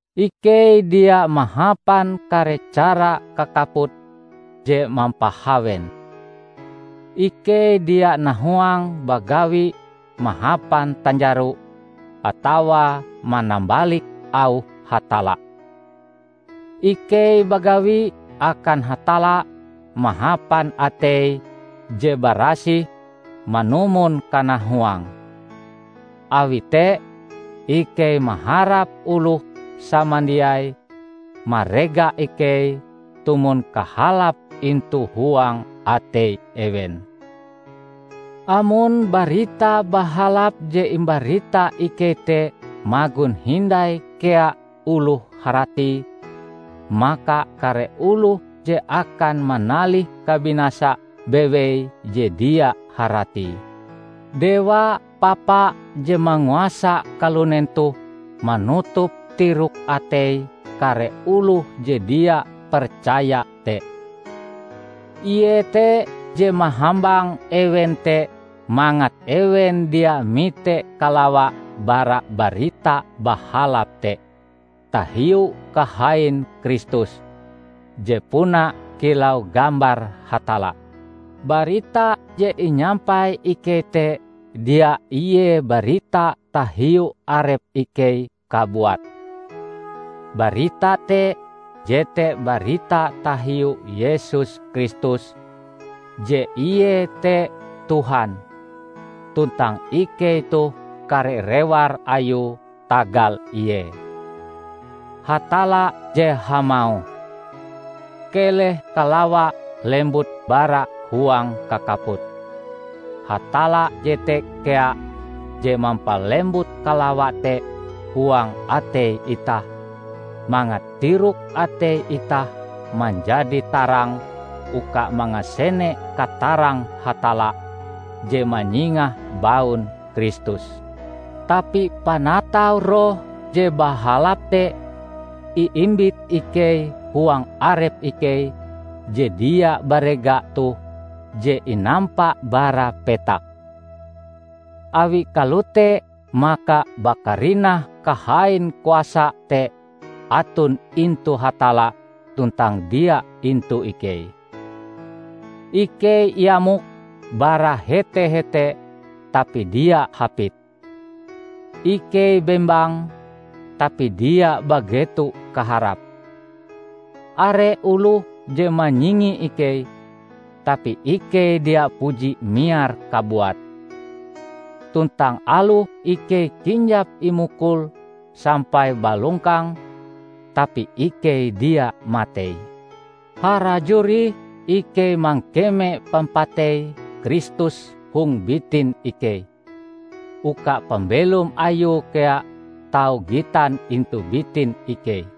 Ikei dia mahapan kare cara kakaput je mampahawen. Ikei dia nahuang bagawi mahapan tanjaro atawa manambalik auh Hatalla. Ikei bagawi akan Hatalla mahapan atei je barasih manumon kanahuange. Awi te, ikei maharap oloh samandiai marega ikei tumon kahalape intu huang atei ewen. Amon Barita Bahalap je imbarita ikei te magon hindai kea oloh haratie, maka kare oloh je akan manalih kabinasa bewei je dia haratie. Dewa papa je manguasa kalunen toh manutup tirok atei kare oloh je dia percaya te. Ie te je mahambang ewen te mangat ewen dia mite kalawa bara Barita Bahalap te tahiu kahain Kristus, je puna kilau gambar Hatalla. Barita je inyampai ikei te dia ie barita tahiu arep ikei kabuat. Barita te jete barita tahiu Yesus Kristus; je ie te Tuhan; tuntang ikei toh kare rewar ayue tagal ie. Hatalla je hamauh, "Keleh kalawa lembut bara huang kakaput," Hatalla jete kea je mampalembut kalawa te huang atei itah, mangat tirok atei itah manjadi tarang uka mangasene katarang Hatalla je manyingah baun Kristus. Tapi panatau roh je bahalap te iimbit ikei huang arep ikei je dia barega toh je inampa bara petak. Awi kalote maka bakarinah kahain kuasa te aton intu Hatalla tuntang dia intu ikei. Ikei iamok bara hete-hete tapi dia hapit. Ikei bembang, tapi dia bageto kaharap. Are oloh je manyingi ikei, tapi ikei dia puji miar kabuat. Tuntang aloh ikei kinjap imukul sampai balongkang, tapi ikei dia matei. Harajur ih ikei mangkeme pampatei Kristus hong bitin ikei, uka pambelom ayue kea tau gitan intu bitin ikei.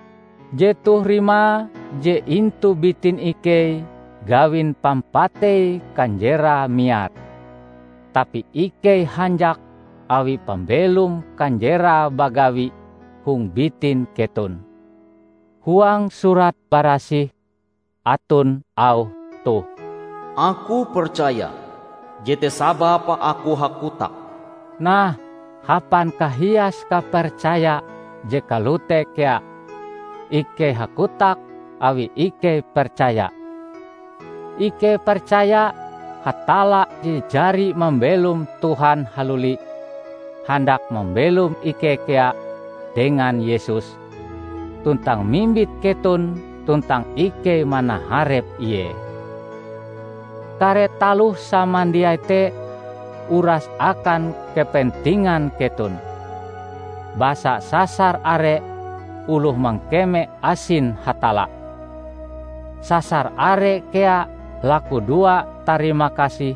Jetoh rimae je intu bitin ikei gawin pampatei kanjerae miar, tapi ikei hanjak awi pambelom kanjerae bagawi hong bitin keton. Huang Surat Barasih aton auh toh, "Aku percaya, jete sababe aku hakotak." Nah, hapan kahias kapercaya je kalote kea, ikei hakotak awi ikei percaya. Ikei percaya Hatalla je jari mambelom Tuhan haluli, handak mambelom ikei kea dengan Yesus, tuntang mimbit keton tuntang ikei manaharep ie. Kare taloh samandiai te uras akan kepentingan keton. Basa sasar are oloh mangkeme asin Hatalla, sasar are kea lakudoa tarimakasih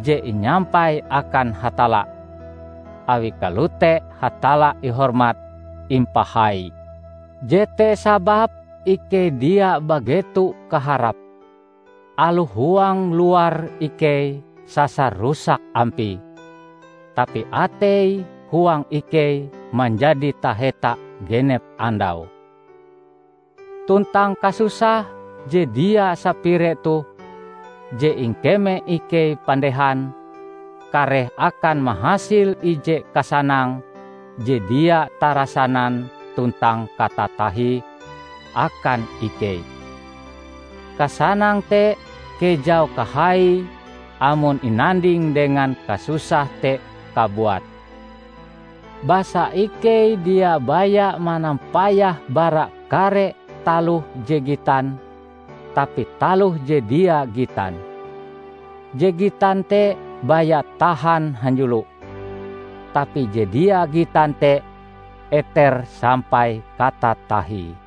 je inyampai akan Hatalla; awi kalote Hatalla ihormat-impahai. Jete sababe ikei dia bageto kaharap. Aloh huang luare ikei sasar rusak ampie, tapi atei-huang ikei manjadi taheta genep andau. Tuntang kasusah je dia sapire toh, je ingkeme ikei pandehan, kareh akan mahasil ije kasanang je dia tarasanan tuntang katatahie akan ikei. Kasanang te kejau kahaie amon inanding dengan kasusah te kabuat. Basa ikei dia baya manampayah bara kare taloh je gitan, tapi taloh je dia gitan. Je gitan te baya tahan hanjulo, tapi je dia gitan te eter sampai katatahie.